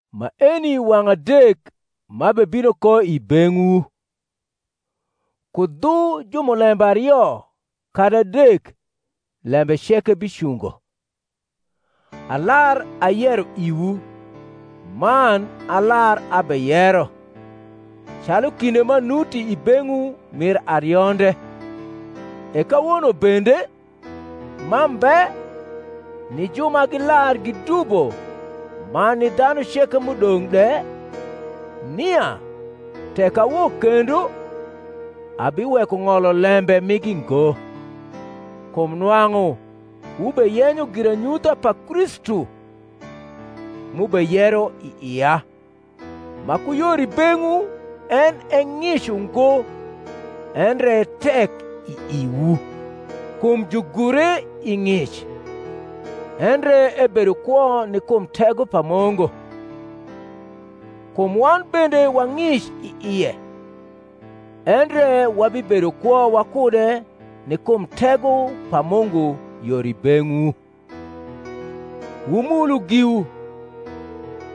Maeni wang’ adek m’abebino ko i beng’wu. Ku dhu jumulembe ario kadi adek lembe ceke bicungo. Alar ayero iwu, man alar abeyero, calu kinde m’anuti i beng’wu mir arionde, e kawono bende, m’ambe, ni ju ma gilar gidubo man ni dhanu ceke m’udong’ de, nia, tek awok kendo, abiweko ng’olo lembe migi ngo; kum nwang’u wubeyenyo giranyutha pa Kristu m’ubeyero i ia; ma ku yor i beng’wu en e ng’ic ungo, endre e tek i iwu: kum jugure i ng’ic, endre ebedo kwo ni kum tego pa Mungu. Kum wan bende wa ng’ic i ie, endre wabibedo kwo wakude ni kum tego pa Mungu yor i beng’wu. Wumulu giwu,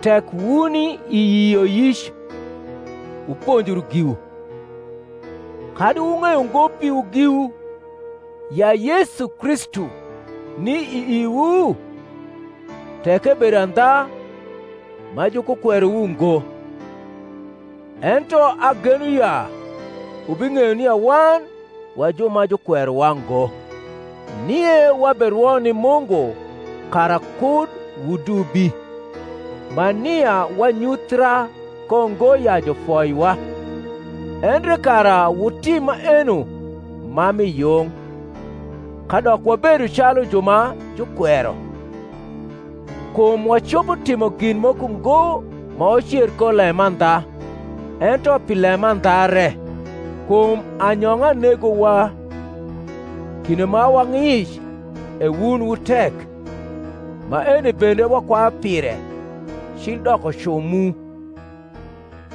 tek wuni i yioyic; wuponjru giwu. Kadi wung’eyo ngo piwu giwu, ya Yesu Kristu ni i iwu? tek ebedo andha ma jukukwerowu ngo. Ento ageno ya wubing’eyo nia wan wa ju ma jukwerowa ngo. Nie waberwo ni Mungu kara kud wudubi; ma nia wanyuthra ko ngo ya jufoiwa, endre kara wutim maeno ma mi yung, kadok wabedo calu ju ma jukwero. Kum wacopo timo gin moko ngo ma wacer ko lemandha, ento pi lemandha re. Kum anyong’a negowa, kinde ma wa ng’ic e wun wu tek: maeni bende wakwayu pire, cil dokocu mu.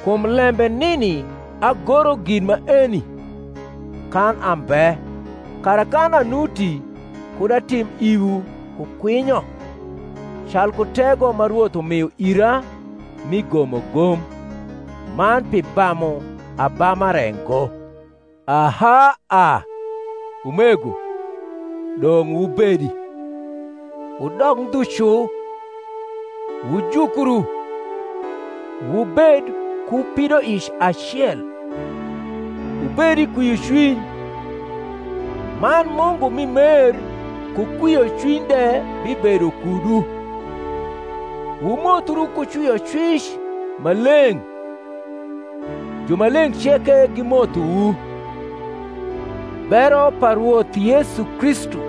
Kum lembe nini agoro gin maeni kan ambe, kara kan anuti kud atim iwu ku kwinyo, calku tego ma Rwoth umio ira mi gomogom, man pi bamu abama re ngo. Aha a, umego, dong’ wubedi. Wudok ndhu cu; wujukru; wubed ku pidoic acel; wubed i kwiocwiny: man Mungu mi mer ku kwiocwiny de bibedo kudu. Wumothru ku cwiocwic ma leng’. Jumaleng’ ceke gimothowu. Bero pa Rwoth Yesu Kristu,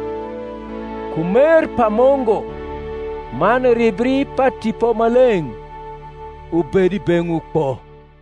ku mer pa Mungu, man ribri pa Tipo Maleng’, ubed i beng’wu kpo.